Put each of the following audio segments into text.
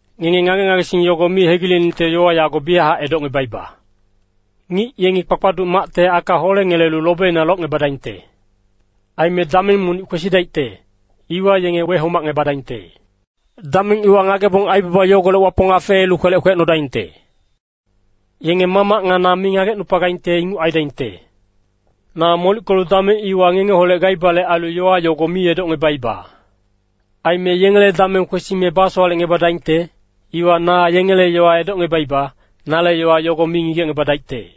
“Ngenge ngage-ngagesing yogo mi hegileningte yowa yago biyachac edocngebaiba. Ngic yengi kpakpaduc macte aka holengelelu lobina locngebadaingte. Aime dameng monic kwesidaicte, iwa yenge wehomacngebadaingte. Dameng iwa ngagebong aibaba yogolec Wapong afeelu kwelec kwecnodaingte. Yenge Mamac nga na mi ngagecnupagaingte inguc aidaingte. Na molickelu dameng iwa ngengeholec gaibale ailu yowa yogo mi edocngebaiba. Aime yengele dameng kwesime basowalecngebadaingte, iwa na yengele yowa edocngebaiba, nale yowa yogo mi ngigecngebadaicte.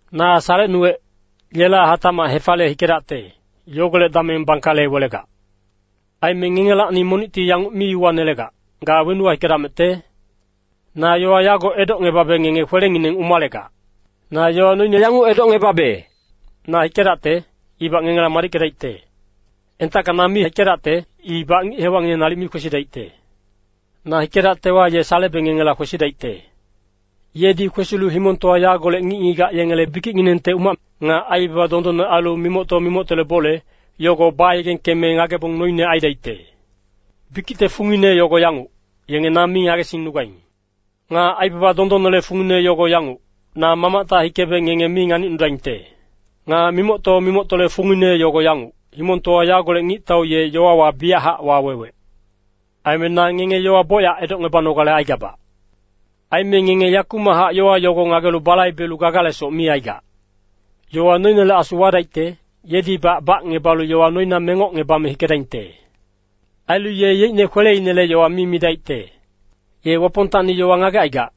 “Na salecnuwec, yela hatacmac hefaliye hikedacte, yogolec dameng bangkale welegac. Aime ngengelacni monicti yanguc mi uwanelegac, ‘Ga wenuwa hikedamecte?’ Na yowa yago edocngebabe ngenge kwelengineng umalegac. Na yowa noine yanguc edocngebabe, na hikedacte, ibac ngengela madickedaicte. Entacka na mi hikedacte, ibac ngic-hewacngineng nalic mi kwesidaicte. Na hikedactewa, ye salebe ngengela kwesidaicte. Yedi kwesilu himongtowa yagolec ngic-ngigac yengele bikicnginengte umac, nga aibaba dondonne ailu mimocto-mimoctole bole, yogo bayegengkeme ngagebong noine aidaicte. Bikicte fungine yogo yanguc, yenge na mi ngagesingnugaing. Nga aibaba dondonnele fungine yogo yanguc, na Mamacta hikebe ngenge mi nganicnudaingte. Nga mimocto-mimoctole fungine yogo yanguc, himongtowa yagolec ngictau ye yowawa biyachac wawewec. “Aime na ngenge yowa bocyac edocngebanogale aigabac. Aime ngenge yakumachac yowa yogo ngagelu balaibelu gagalesoc mi aigac. Yowa noinele Asu wadaicte, yedibac bacngebalu yowa noina mengocngebame hikedaingte. Ailu ye yeicne kweleinele yowa mi midaicte. Ye Wapongtacni yowa ngagecaigac,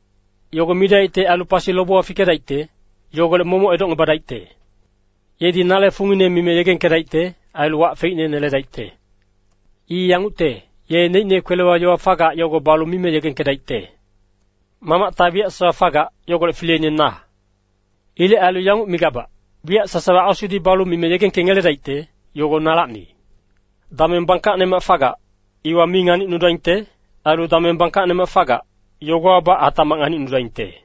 yogo midaicte ailu pasi lobewa fikedaicte, yogolec momoc edocngebadaicte. Yedi nale fungine mime yegengkedaicte, ailu wac feicne neledaicte. I yangucte, ye neicne kwelewa yowa fagac, yogo balu mime yegengkedaicte. Mamacta wiyac sasawa fagac, yogolec fileine na. Ilec ailu yanguc migabac, wiyac sasawa Asudi balu mime yegengkengeledaicte, yogo nalacni. Dameng bangkacnemac fagac, iwa mi nganicnudaingte. Ailu dameng bangkacnemac fagac, yogowabac hatacmac nganicnudaingte.”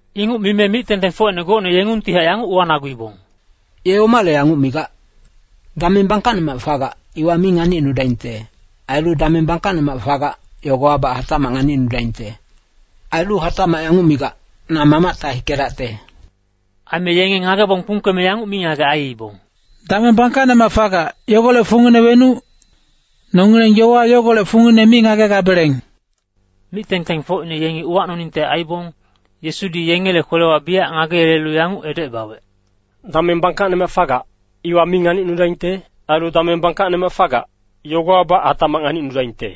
Inguc mime mic-tengtengfocine gocne yengungtihac yanguc uwanaguibong, “Ye omale yanguc migac? ‘Dameng bangkacnemac fagac, iwa mi nganicnudaingte. Ailu dameng bangkacnemac fagac, yogowabac hatacmac nganicnudaingte.’ Ailu hatacmac yanguc migac, ‘Na Mamacta hikedacte.’” Aime yenge ngagebong kpungkeme yanguc mingagec aiibong, “Dameng bangkacnemac fagac, yogolec fungine wenuc? Nongileng yowa yogolec fungine mi ngagegabeleng.” Mic-tengtengfocine yengi uwacnoningte aibong, Yesudi yengele kwelewa biyac ngageyelelu yanguc edocebawec, “Dameng bangkacnemac fagac, iwa mi nganicnudaingte. Ailu dameng bangkacnemac fagac, yogowabac hatacmac nganicnudaingte.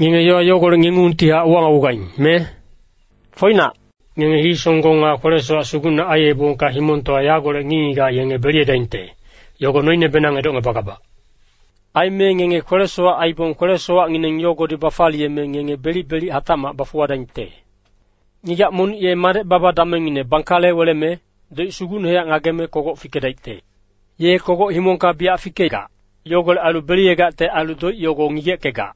Ngenge yowa yogolec ngengungtihac uwanagugaing, me? Foinac, ngenge hii-songgong nga kwele-sowac sugucne aiyebongka himongtowa yagolec ngic-ngigac yenge beliyedaingte, yogo noinebenang edocngebagabac. Aime ngenge kwele-sowac aibong kwele-sowacngineng yogodi bafaliyeme ngenge belic-belic hatacmac bafuwadaingte. Ngigac monic ye madec-baba damengngine bangkale weleme, doic sugucnehac ngageme kogoc fikedaicte. Ye kogoc himongka biyac fikegac. Yogolec ailu beliyegacte ailu doic yogo ngigeckegac.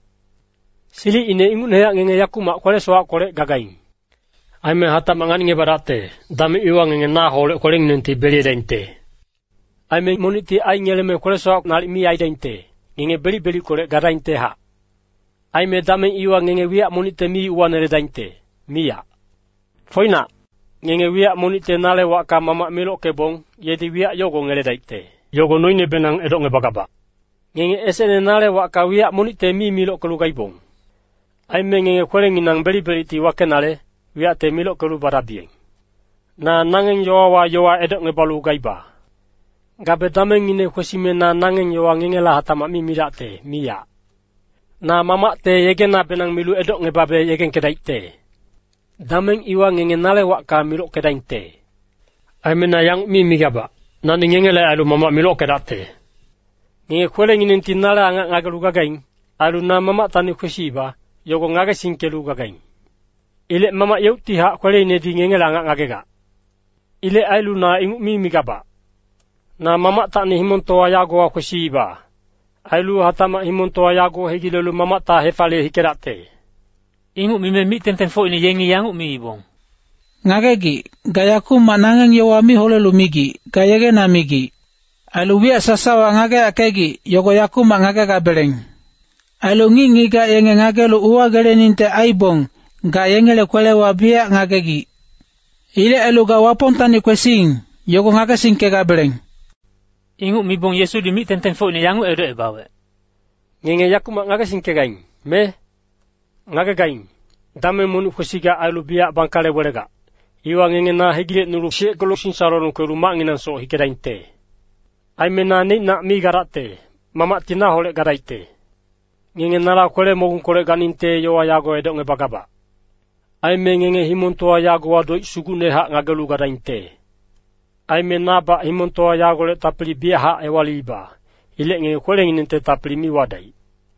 Silicine ingucnehac ngenge yakumac kwele-sowackolec gagaing. Aime hatacmac nganicngebadacte, dameng iwa ngenge naholec kwelenginengti beliyedaingte. Aime monicti aingeleme kwele-sowac nalic mi aidaingte, ngenge belic-belickolec gadaingtehac. “Aime dameng iwa ngenge wiyac monicte mi uwaneledaingte, miyac. Foinac, ngenge wiyac monicte nale wacka Mamac milockebong, yedi wiyac yogo ngeledaicte, yogo noinebenang edocngebagabac. Ngenge esecne nale wacka wiyac monicte mi milockelu gaibong. Aime ngenge kwelenginang belic-belicti wakenale, wiyacte milockelu badabiyeng. “Na nangeng yowawa yowa edocngebalu gaiba. Gabe damengngine kwesime na nangeng yowa ngengela hatacmac mi midacte, miyac. Na Mamacte yegenabenang milu edocngebabe yegengkedaicte. Dameng iwa ngenge nale wacka milockedaingte. Aime na yanguc mi migabac, nani ngengele ailu Mamac milockedacte. Ngenge kwelenginengti nale angac ngagelu gagaing. Ailu na Mamactacni kwesiiba, yogo ngagesingkelu gagaing. Ilec Mamac yeuctihac kweleinedi ngengele angac ngagegac. Ilec ailu na inguc mi migabac. Na Mamactacni himongtowa yagowa kwesiiba. Ailu hatacmac himongtowa yago hegilelu Mamacta hefaliye hikedacte.” Inguc mime mic-tengtengfocine yengi yanguc miibong, “Ngagegic, ga yakumac nangeng yowa mi holelu migic, ga yegena migic. Ailu wiyac sasawa ngageyackegic, yogo yakumac ngagegabeleng. Ailu ngic-ngigac yenge ngagelu uwageleningte aibong, ga yengele kwelewa biyac ngagegic. Ilec ailu ga Wapongtacni kwesiing, yogo ngagesingkegabeleng.” Inguc mibong Yesudi mic-tengtengfocine yanguc edocebawec, “Ngenge yakumac ngagesingkegaing, me? Ngagegaing, dameng monic kwesigac ailu biyac bangkale welegac, iwa ngenge na hegilecnulu siyeckelu singsalolong kwelu macnginangsoc hikedaingte. Aime na neicnac mi gadacte, Mamacti naholec gadaicte. Ngenge nala kwele-mogungkolec ganingte yowa yago edocngebagabac. Aime ngenge himongtowa yagowa doic sugucnehac ngagelu gadaingte. Aime nabac himongtowa yagolec tapili biyachac ewaliiba. Ilec ngenge kwelenginengte tapili mi wadaic.”